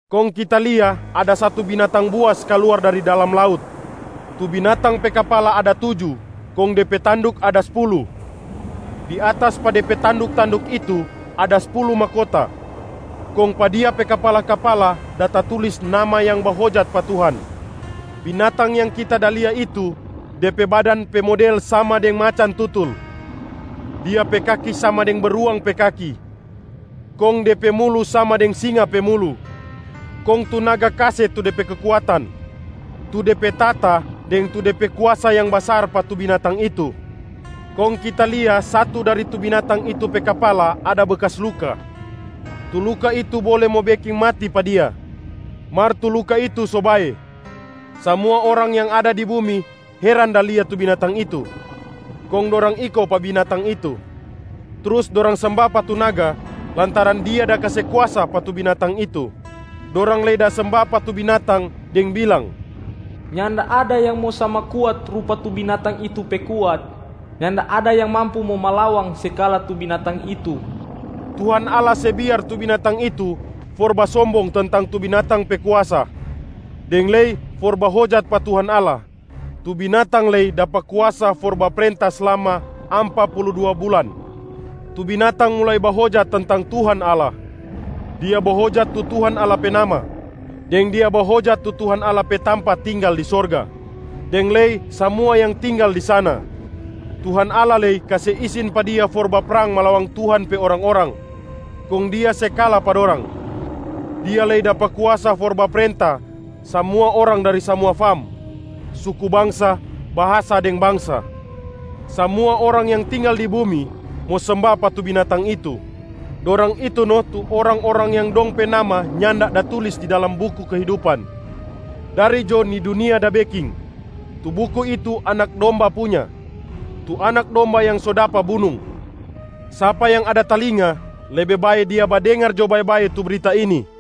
Kong kita lia ada satu binatang buas kaluar dari dalam laut. Tu binatang pe kapala ada tuju kong de pe tanduk ada spulu. Di atas pa de pe tanduk-tanduk itu ada spulu mahkota, kong pa dia pe kapala-kapala da tatulis nama yang bahojat pa Tuhan. Binatang yang kita da lia itu, de pe badan pe model sama deng macan tutul. Dia pe kaki sama deng beruang pe kaki, kong de pe mulu sama deng singa pe mulu. Kong tu naga kase tu de pe kekuatan, tu de pe tahta deng tu de pe kuasa yang basar pa tu binatang itu. Kong kita lia satu dari tu binatang itu pe kapala ada bekas luka. Tu luka itu bole mo beking mati pa dia, mar tu luka itu so bae. Samua orang yang ada di bumi heran da lia tu binatang itu, kong dorang iko pa binatang itu. Trus dorang semba pa tu naga lantaran dia da kase kuasa pa tu binatang itu. Dorang lei da semba pa tu binatang deng bilang, “Nyanda ada yang mo sama kuat rupa tu binatang itu pe kuat. Nyanda ada yang mampu mo malawang se kala tu binatang itu.” Tuhan Allah se biar tu binatang itu for basombong tentang tu binatang pe kuasa deng lei for bahojat pa Tuhan Allah, tu binatang lei dapa kuasa for baprenta slama ampa pulu dua bulan. Tu binatang mulai bahojat tentang Tuhan Allah, dia bahojat tu Tuhan Allah pe nama, deng dia bahojat tu Tuhan Allah pe tampa tinggal di sorga deng lei samua yang tinggal di sana. Tuhan Allah lei kase isin pa dia for baprang malawang Tuhan pe orang-orang, kong dia se kala pa dorang. Dia lei dapa kuasa for baprenta samua orang dari samua fam, suku bangsa, bahasa deng bangsa. Samua orang yang tinggal di bumi mo semba pa tu binatang itu. Dorang itu no tu orang-orang yang dong pe nama nyanda da tulis di dalam buku kehidupan, dari jo ni dunia da beking. Tu buku itu Anak Domba punya, tu Anak Domba yang so dapa bunung. Sapa yang ada talinga, lebe bae dia badengar jo bae-bae tu brita ini,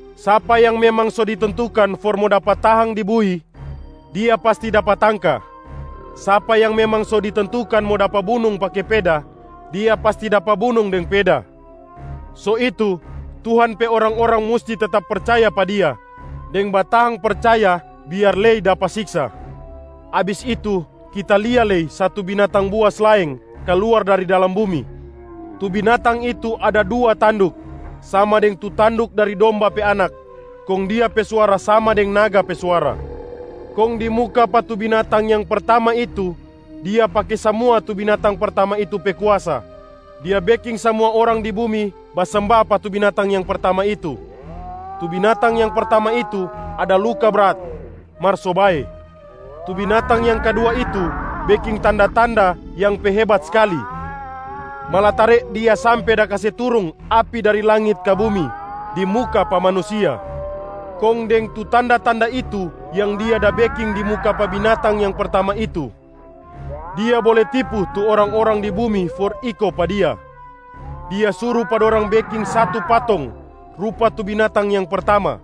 “Sapa yang memang so ditentukan for mo dapa tahang di bui, dia pasti dapa tangka. Sapa yang memang so ditentukan mo dapa bunung pake peda, dia pasti dapa bunung deng peda.” So itu, tu Tuhan pe orang-orang musti tetap percaya pa Dia deng batahang percaya biar lei dapa siksa. Abis itu kita lia lei satu binatang buas laeng kaluar dari dalam bumi. Tu binatang itu ada dua tanduk sama deng tu tanduk dari domba pe anak, kong dia pe suara sama deng naga pe suara. Kong di muka pa tu binatang yang pertama itu, dia pake samua tu binatang pertama itu pe kuasa. Dia beking samua orang di bumi basemba pa tu binatang yang pertama itu. Tu binatang yang pertama itu ada luka brat, mar so bae. Tu binatang yang kadua itu beking tanda-tanda yang pe hebat skali, malatare dia sampe da kase turung api dari langit ka bumi di muka pa manusia. Kong deng tu tanda-tanda itu yang dia da beking di muka pa binatang yang pertama itu, dia bole tipu tu orang-orang di bumi for iko pa dia. Dia suru pa dorang beking satu patong rupa tu binatang yang pertama,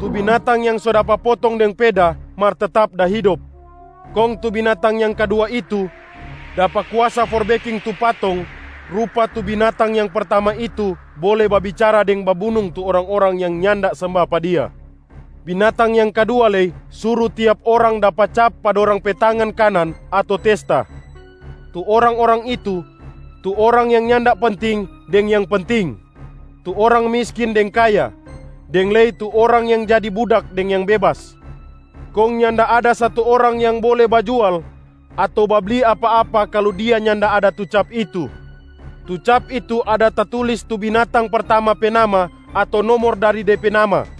tu binatang yang so dapa potong deng peda mar tetap da hidop. Kong tu binatang yang kadua itu dapa kuasa for beking tu patong rupa tu binatang yang pertama itu bole babicara deng babunung tu orang-orang yang nyanda semba pa dia. Binatang yang kadua lei suru tiap orang dapa cap pa dorang pe tangan kanan ato testa. Tu orang-orang itu, tu orang yang nyanda penting deng yang penting, tu orang miskin deng kaya, deng lei tu orang yang jadi budak deng yang bebas. Kong nyanda ada satu orang yang bole bajual ato babli apa-apa kalu dia nyanda ada tu cap itu. Tu cap itu ada tatulis tu binatang pertama pe nama ato nomor dari de pe nama.